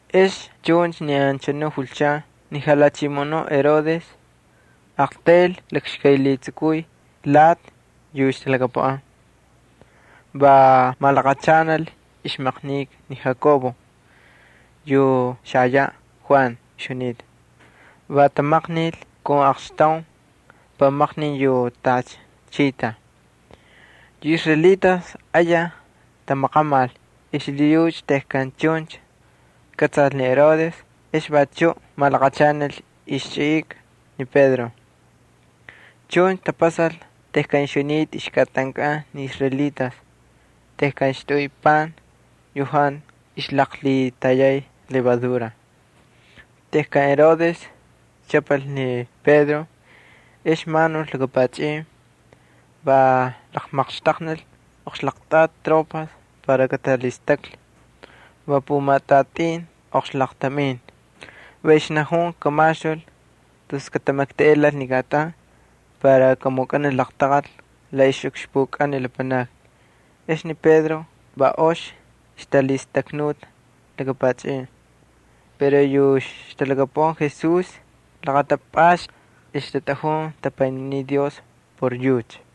Ex chuncha ni anchanu julchan ni jalhachimoꞌonuꞌ Herodes aqtayl lakxkaylhitsukuy lati yu ixtalhakapuꞌan. Va malaqachanal ixmaqnika ni Jacobo yu xajayaꞌ Juan ixjunita. Va tamaqnil kun aqxtaun espada. Yu israelitas ayaj tamaqamal xlhiyucha tejkan chuncha kꞌatsal ni Herodes ex vachuꞌ malaqachanal ixchꞌika ni Pedro. Chuncha tapasal tejkan ixjunita ixkꞌatankꞌan ni israelitas tejkan ixtaꞌuy pan yu jantu ixlaqlhitayay levadura. Tejkan Herodes chꞌapal ni Pedro ex manul laka pachꞌin, va laqmaqxtaqnil oqxlaqtꞌati tropas para katalhistaklhi. Va pumatꞌatin oqxlaqtamin. Va ixnajun kamaxtul tus katamaktaꞌelal xakꞌatan Paxku, para kamukꞌanil laqtaqal la ixlakaꞌukxpukꞌan ni lapanakni. Ex ni Pedro va ox ixtalhistaknuta laka pachꞌin, pero yu ixtalhakapuꞌan Jesús laqatapꞌasta ixtatꞌajun tapayninin Dios por yucha.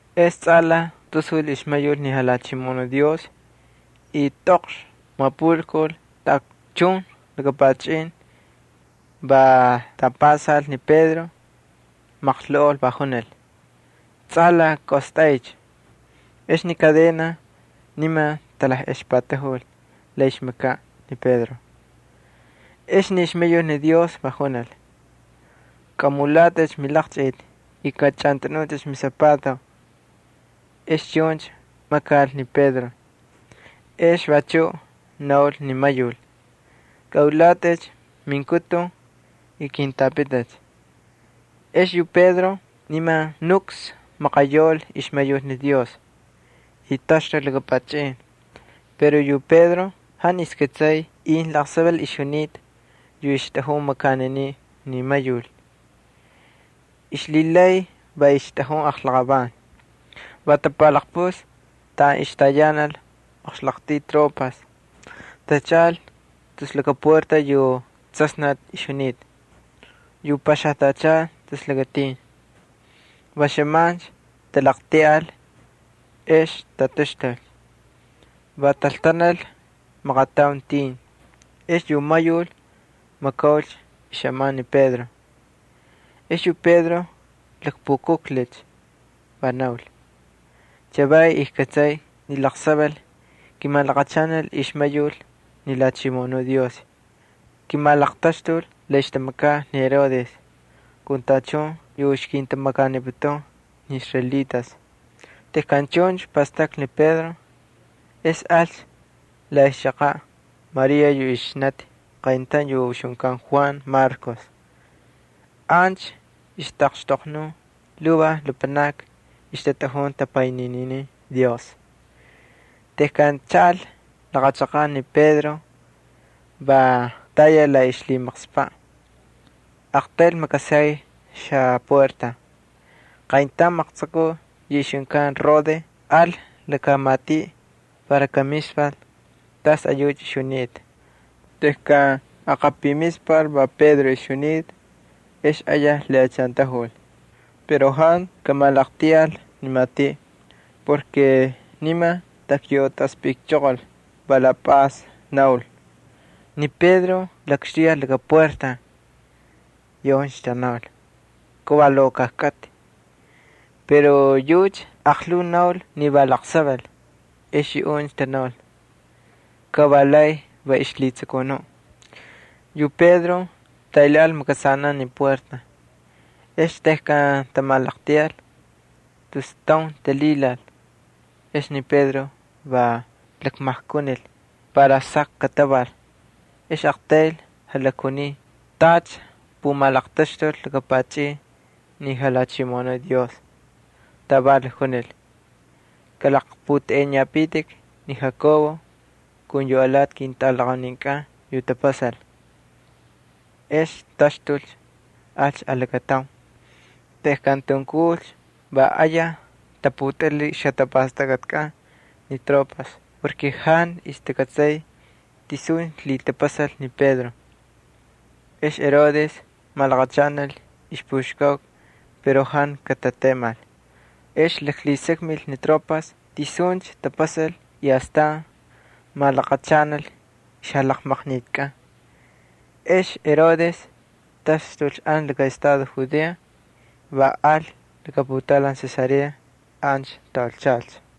Ex tsꞌalaj tasul ixmayul ni Jalhachimoꞌonuꞌ Dios y tꞌoql mapulkul taꞌakchun laka pachꞌin. Va tampasal ni Pedro, maqloꞌol, va junil: —¡Tsꞌalaj kaꞌostꞌaycha! Ex ni kadenas niman talajꞌexpatajul la ixmakaꞌ ni Pedro. Ex ni ixmayul Dios va junil: —Kꞌamulatꞌicha milaqchꞌiti y kachꞌantꞌanutꞌicha misapato. Ex chuncha makal ni Pedro. Ex vachuꞌ naul ni mayul: —Kꞌalhilaqapaqaqkꞌacha minkutun y kintꞌapꞌitꞌicha. Ex yu Pedro niman nuks maqayaul ixmayul ni Dios, y tataxtul laka pachꞌin. Pero yu Pedro jantu ixkꞌatsay incha laqsaval ixjunita yu ixtꞌajun makaniniꞌ ni mayul. Ixlhilay va ixtꞌajun aqlaqavan. Va tapalaqpuslhi taꞌan ixtayanal oqxlaqtꞌuy tropas, tachaꞌal tus laka puerta yu tsasnati ixjunita, yu paxajtachal tus lakatin. Va xꞌaman talaqltiꞌal, ex tataxtul. Va taltanal maqataun tin. Ex yu mayul laqatsꞌalaj makaulcha xꞌaman ni Pedro. Ex yu Pedro lakpukujlhicha, va naul: —Chavay ijkꞌatsay ni laqsaval kimalaqachanil ixmayul ni Jalhachimoꞌonuꞌ Dios. Kimalaqtaxtul la ixtamakaꞌ ni Herodes kun tachun yu ixkintamakaniputun ni israelitas. Tejkan chuncha pastaklhi ni Pedro, ex alcha la ixchaqaꞌ María yu ixnati qayntaun yu ixjunkan Juan Marcos. Ancha ixtaꞌaqxtoqnun lhuvaj lapanakni, ixtatꞌajun tapaynininin Dios. Tejkan chaꞌal laqa chaqaꞌ ni Pedro, va tayal la ixlhimaqspaꞌ, aqtayl makasay xapuerta. Qayntaun maqtsukuꞌ yu ixjunkan Rode al laka matiꞌ para kamispal tas ayucha ixjunita. Tejkan aqapimispal va Pedro ixjunita ex ayaj lhiꞌachantajul. Pero jantu kamalaqltiꞌal ni puerta porke niman takyautaspꞌikchoqol, va la pꞌas naul: —¡Ni Pedro lakxtuyal laka puerta! Yuꞌuncha tanaul: —Ka va lokoj kꞌatꞌi. Pero yucha aqlhuu naul ni va laqsaval. Ex yuꞌuncha tanaul: —Kavalay va ixjalhitsukunuꞌ. Yu Pedro taylhaꞌal makasanaꞌ ni puerta. Ex tejkan tamalaqltiꞌal, tus taun talhilal. Ex ni Pedro va lakmajkunil para saq kataval. Ex aqtayl jalakjuniy tacha pumalaqtaxtul laka pachꞌin ni Jalhachimoꞌonuꞌ Dios. Taval jalakjunil: —Kꞌalaqpꞌutꞌeꞌeniyapitik ni Jacobo kun yu alati ketꞌalaqauninkꞌan yu ktapasal. Ex taxtulcha, alcha alakataun. Tejkan tunkulcha va ayaj taputꞌilhil ixjatapastakꞌatikꞌan ni tropas porke jantu ixtakꞌatsay tisuncha lhitapasalcha ni Pedro. Ex ni Herodes malaqachanal ixpuxkauka pero jantu katatemal. Ex jalhisakmil ni tropas tisuncha tapasal y astan malaqachanal ixjalaqmaqnikakꞌan ni anchanu tropas. Ex ni Herodes taxtul ancha laka estado Judea, va al laka putaulan Cesarea. Ancha taulchalcha.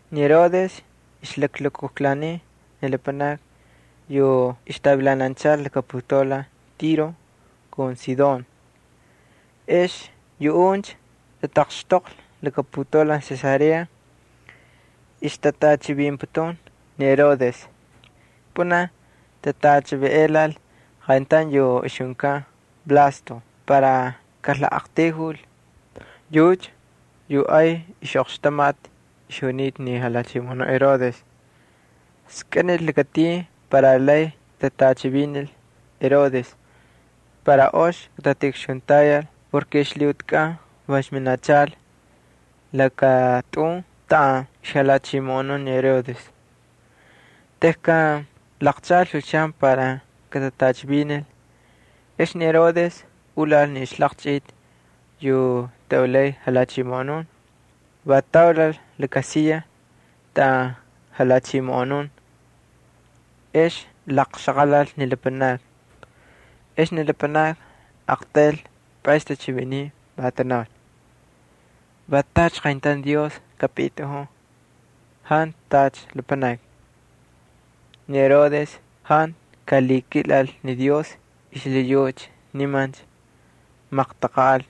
Ni Herodes ixlaklukujlaniy ni lapanakni yu ixtavilananchal laka putaulan Tiro kun Sidón. Ex yuꞌuncha tataqxtoqlhi laka putaulan Cesarea, ixtatꞌachivinputun ni Herodes. Pꞌunaj tatꞌachivinꞌelal qayntaun yu ixjunkan Blasto para kalaqꞌaqtayjul. Yucha yu ay ixꞌoqxtamati ixjunita ni jalhachimoꞌonuꞌ Herodes. Skꞌinil lakatin para lay katatꞌachivinil Herodes para ox katatiꞌukxuntayal porke ixlhiꞌutikꞌan va ixminachal laka tꞌun taꞌan ixjalhichimoꞌonun ni Herodes. Tejkan laqchaꞌalcha julchan para katatꞌachivinil, ex ni Herodes ulal ni laqchꞌiti yu taꞌulay jalhachimoꞌonun, va taulal laka siya taꞌan jalhachimoꞌonun. Ex laqxaqalal ni lapanakni. Ex ni lapanakni aqtayl pꞌaysni tachiviniy, va tanaul: —Va tacha qayntaun dios akapitꞌajun jantu tacha lapanaki. Ni Herodes jantu ay kamakal ni Dios xlhiyucha niman maqtaqanꞌal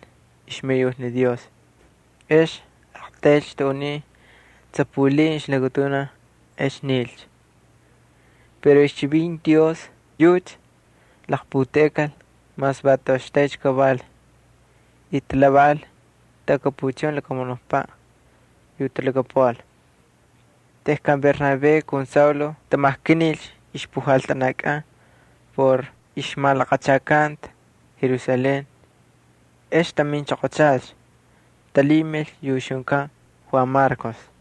ixmayul ni Dios. Ex aqtaylcha taꞌuniy tsapulin ixlakatunaj, ex nilcha. Pero ixchivinti Dios yucha laqputeꞌekal mas va toꞌoxtaycha kaval y talhavaꞌal taꞌakapuchun lakamunukpaꞌ yu talhakapuꞌal. Tejkan ni Bernabé kun Saulo tamajkanilcha ixpujaltanakꞌan por ixjamalaqachakanta Jerusalén, ex taminchoqochalcha. Talhimil yu ixjunkan Juan Marcos.